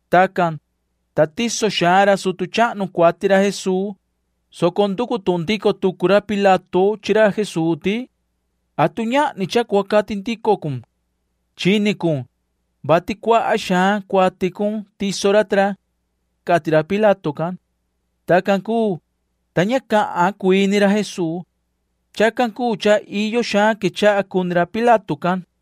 Tacan, ta tiso xaan ra sutu chahnu cuati ra Jesuu, soco nducu tuhun ndico tucu ra Pilato chi ra Jesuu ti: ―¿Atu ñahni cha cua cati ndico cun? Chini cun, vati cuaha xaan cuati cun tiso ra ta ra ―cati ra Pilato can. Tacan cuu, ta ña cahan cuii ni ra Jesuu. Chacan cuu cha iyo xaan quechaha cuni ra Pilato can.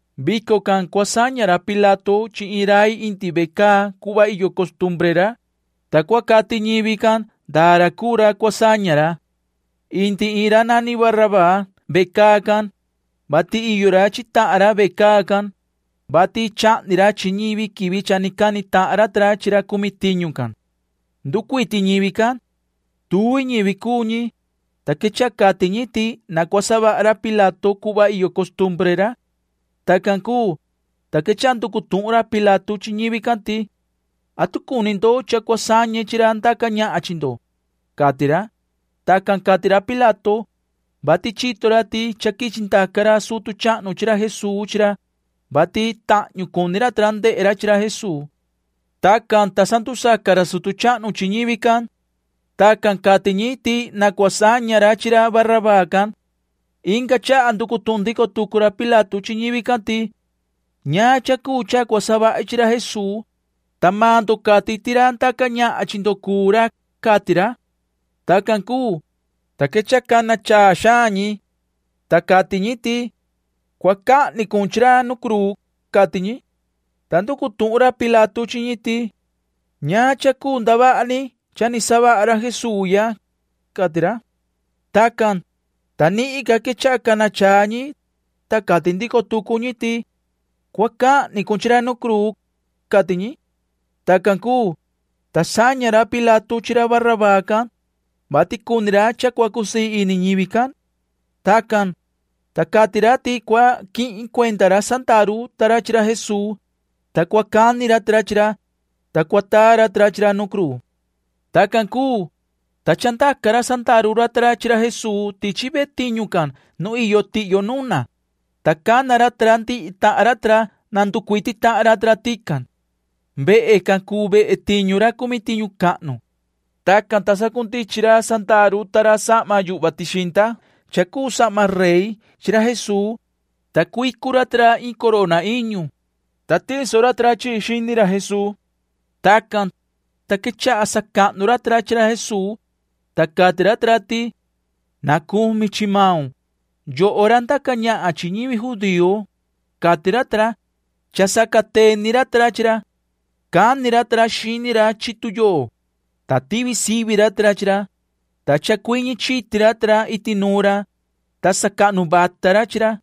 Vico can cua saña ra Pilato chi iin ra indi ve caa cuhva iyo costumbre ra, ta cua cati ñivi can ndaa ra cuu ra cua saña ra. Indi iin ra nani Barabaa ve caa can, vati iyo ra chi tahan ra ve caa can, vati cha chahni ra chi ñivi quivi cha ni cani tahan ra ta ra chi ra cumi tiñu can. Nducuiti ñivi can. Tuvi ñivi cuu ñi, ta quechaha cati ñi ti na cua savaha ra Pilato cuhva iyo costumbre ra. Tacan cuu, ta quechaha nducu tuhun ra Pilato chi ñivi can ti: ―¿Atu cuni ndo cha cua sañe chi ra ndaca ñahan chi ndo? ―cati ra. Tacan cati ra Pilato, vati chito ra ti cha quichi ndaca ra sutu chahnu chi ra Jesuu chi ra, vati tahñu cuni ra ta ra ndehe ra chi ra Jesuu. Tacan, ta sandusaca ra sutu chahnu chi ñivi can. Tacan cati ñi ti na cua saña ra chi ra Barabaa can. Inga chaha nducu tuhun ndico tucu ra Pilato chi ñivi can ti: ―¿Ñaan cha cuu cha cua savahi chi ra Jesuu, ta maan ndo cati ti ra ndaca ñahan chi ndo cuu ra? ―cati ra. Tacan cuu, ta quechaha cana chaa xaan ñi, ta cati ñi ti: ―Cua cahni cun chi ra nu cruu ―cati ñi. Ta nducu tuhun ra Pilato chi ñi ti: ―¿Ñaan cha cuu ndavaha ni cha ni savaha ra Jesuu ya? ―cati ra. Tacan, ta nihin ca quechaha cana chaa ñi, ta cati ndico tucu ñi ti: ―Cua cahni cun chi ra nu cruu ―cati ñi. Tacan cuu, ta saña ra Pilato chi ra Barabaa can, vati cuni ra cha cua cusii ini ñivi can. Tacan, ta cati ra ti cua quihin cuenda ra sandaru ta ra chi ra Jesuu, ta cua cani ra ta ra chi ra, ta cua taa ra ta ra chi ra nu cruu. Tacan cuu, ta chandaca ra sandaru ta ra chi ra Jesuu tichi ve tiñu can nu iyo tihyo nu nuna, ta cana ra ta ra ndihi tahan ra na nducuiti ra ta ra tican. Vehe can cuu vehe tiñu ra cumi tiñu cahnu. Tacan, ta sacundichin ra sandaru ta ra sahma yuhva tixinda [cha cuu sahma rey] chi ra Jesuu, ta cuicu ra ta ra iin corona iñu, ta tiso ra ta ra chi chi xini ra Jesuu. Tacan, ta quechaha sacahnu ra ta ra chi ra Jesuu, ta cati ra ta ra ti: ―Na cumi chi maun, yoho ra ndaca ñahan chi ñivi judío ―cati ra ta ra [cha sacateni ra ta ra chi ra]. Cani ra ta ra xini ra chi tuyoo, ta tivi sivi ra ta ra chi ra, ta chacuiñi chiti ra ta ra iti nuun ra, ta sacahnu vata ra chi ra.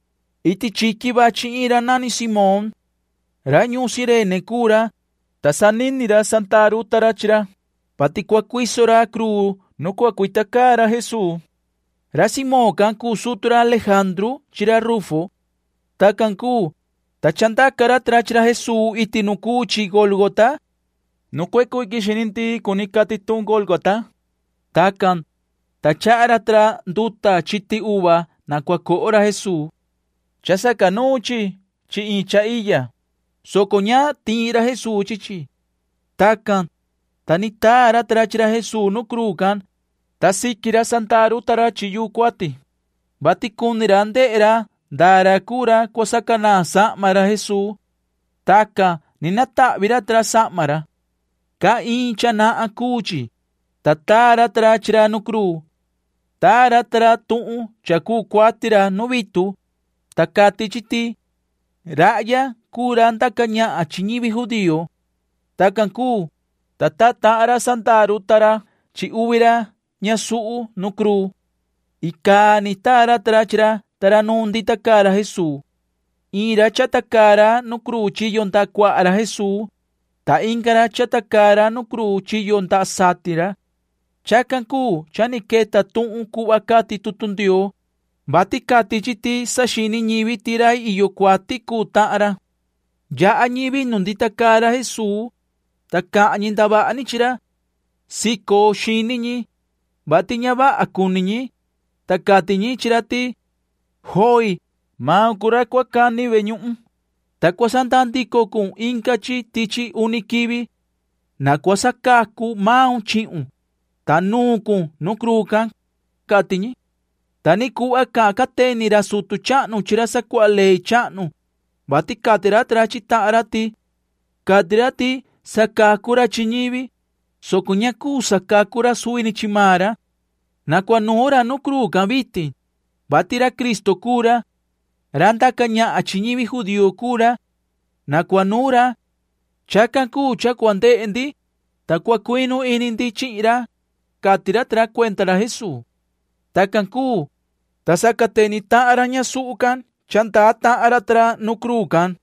Iti chiqui vachi iin ra nani Simón. Ra ñuun Cirene cuu ra, ta sanini ra sandaru ta ra chi ra, vati cua cuiso ra cruu nu cua cuita caa ra Jesuu. Ra Simón can cuu sutu ra Lejandru chi ra Rufo. Tacan cuu, ta chandaca ra ta ra chi ra Jesuu iti nu cuu chi Gólgota. Nu cuecu iquin xini ndii cati tuhun Gólgota can. Tacan, ta chaha ra ta ra nduta chiti uva na cua coho ra Jesuu. Cha sacanuun chi chi iin cha iya, soco ña tiin ra Jesuu chi chi. Tacan, ta ni taa ra ta ra chi ra Jesuu nu cruu can, ta siqui ra sandaru ta ra chi yuu cuati, vati cuni ra ndehe ra ndaa ra cuu ra cua sacanaan sahma ra Jesuu. Tacan ni natahvi ra ta ra sahma ra. Caa iin cha nahan cuu chi, ta taa ra ta ra chi ra nu cruu. Taa ra ta ra tuhun cha cuu cuati ra nu vitu, ta cati chi ti: “Rahya cuu ra ndaca ñahan chi ñivi judío.” Tacan cuu, ta taa tahan ra sandaru ta ra chi uvi ra ñasuhu nu cruu. Icaa ni taa ra ta ra chi ra ta ra nu ndita caa ra Jesuu. Iin ra chata caa ra nu cruu chiyo ndaha cuaha ra Jesuu, ta inga ra chata caa ra nu cruu chiyo ndaha satin ra. Chacan cuu cha ni queta tuhun cuhva cati tutu Ndioo, vati cati chi ti saxini ñivi ti rai iyo cuati cuu tahan ra. Yaha ñivi nuun ndita caa ra Jesuu, ta cahan ñi ndavaha ni chi ra. Sico xini ñi, [vati ña vaha cuni ñi,] ta cati ñi chi ra ti: ―Joi. Maun cuu ra cua cani ve ñuhun, ta cua sandaa ndico cun inga chi tichi uni quivi. Na cua sacacu maun chihun, ta nuun cun nu cruu can ―cati ñi. Ta ni cuhva cahan cateni ra sutu chahnu chi ra sacuaha ley chahnu, vati cati ra ta ra chi tahan ra ti: ―Cati ra ti sacacu ra chi ñivi, soco ña cuu sacacu ra suvi ni chi maan ra. Na cua nuun ra nu cruu can vitin, vati ra Cristo cuu ra. Ra ndaca ñahan chi ñivi judío cuu ra. Na cua nuun ra. Chacan cuu cha cua ndehe ndi, ta cua cuinu ini ndi chihin ra ―cati ra ta ra cuenda ra Jesuu. Tacan cuu, ta sacateni tahan ra ñasuhu can cha ndaa tahan ra ta ra nu cruu can.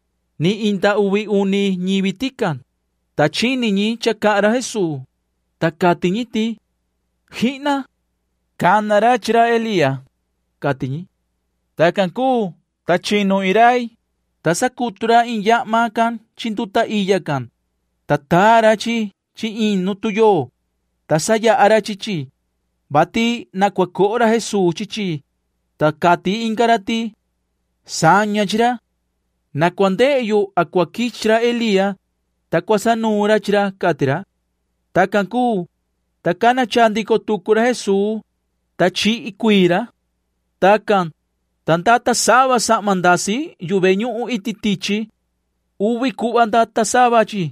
Ni inda uvi uni ñivi tican, ta chini ñi cha cahan ra Jesuu, ta cati ñi ti: ―¡Jihna! Cha cana ra chi ra Elía ―cati ñi. Tacan cuu, ta chinu iin rai, ta sacutu ra iin yahma can chi nduta iya can, ta taa ra chi chi iin nu tuyoo, ta sayaha ra chi chi, vati na cua coho ra Jesuu chi chi, ta cati inga ra ti: ―Saña chi ra. Na cua ndehe yo a cua quichi ra Elía, ta cua sanuun ra chi ra ―cati ra. Tacan cuu, ta cana chaa ndico tucu ra Jesuu, ta chihi cuii ra. Tacan, ta ndata sava sahma ndasi yu ve ñuhun iti tichi. Uvi cuhva ndata sava chi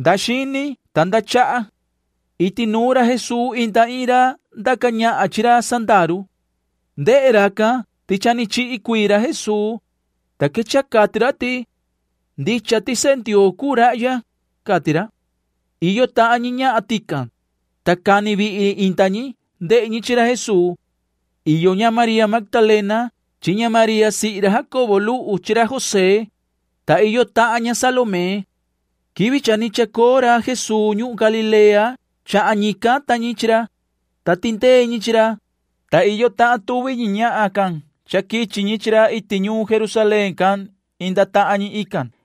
nda xini ta nda chaha. Iti nuun ra Jesuu inda iin ra ndaca ñahan chi ra sandaru. Ndehe racan ti cha ni chihi cuii ra Jesuu, ta quechaha cati ra ti: ―Ndicha ti sehe Ndioo cuu rahya ―cati ra. Iyo tahan ñi ñahan tican, ta cani vihi inda ñi ndehe ñi chi ra Jesuu. Iyo ña María Magdalena chi ña María sihi ra Jacobo luhu chi ra José, ta iyo tahan ña Salomé. Quivi ni chacoo ra Jesuu ñuhun Galilea chahan ñican ta ñi chi ra, ta tindee ñi chi ra, ta iyo tahan tuvi ñi ñahan can cha quichi chi ra iti ñuun Jerusalén can inda tahan ñi ican.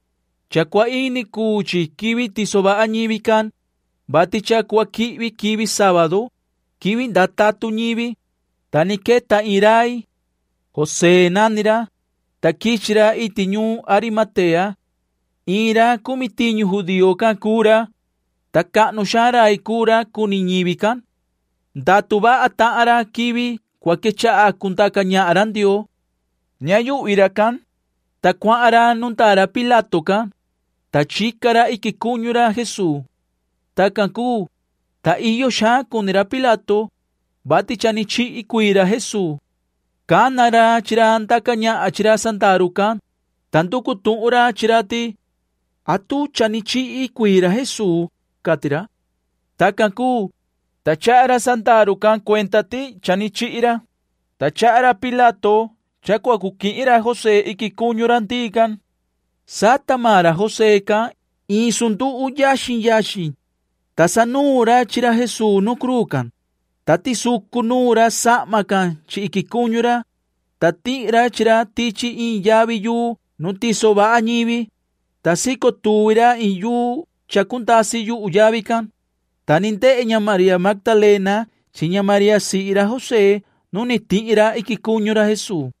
Cha cua ini cuu chi quivi tiso vaha ñivi can, vati cha cua quihvi quivi sábadu [quivi ndaa tatun ñivi], ta ni queta iin rai. José nani ra, ta quichi ra iti ñuun Arimatea. Iin ra cumi tiñu judío can cuu ra, ta cahnu xaan rai cuu ra cuni ñivi can. Ndatu vaha tahan ra quivi cua quechaha cundaca ñahan ra Ndioo. Ña yuhvi racan, ta cuahan ra nu ndaa ra Pilato can, ta chica ra iquin cuñu ra Jesuu. Tacan cuu, ta iyo xaan cuni ra Pilato, vati cha ni chihi cuii ra Jesuu. Cana ra chi ra ndaca ñahan chi ra sandaru can, ta nducu tuhun ra chi ra ti: ―¿Atu cha ni chihi cuii ra Jesuu? ―cati ra. Tacan cuu, ta chaha ra sandaru can cuenda ti cha ni chihi ra, ta chaha ra Pilato cha cua cu quihin ra José iquin cuñu ra ndii can. Sata maan ra José can iin sanduhu yaxin yaxin, ta sanuun ra chi ra Jesuu nu cruu can, ta tisucu nuun ra sahma can chi iquin cuñu ra, ta tihi ra chi ra tichi iin yavi yuu nu ni tiso vaha ñivi, ta sico tuvi ra iin yuu cha cundasi yuhu yavi can, ta ni ndehe ña María Magdalena chi ña María sihi ra José nu ni tihi ra iquin cuñu ra Jesuu.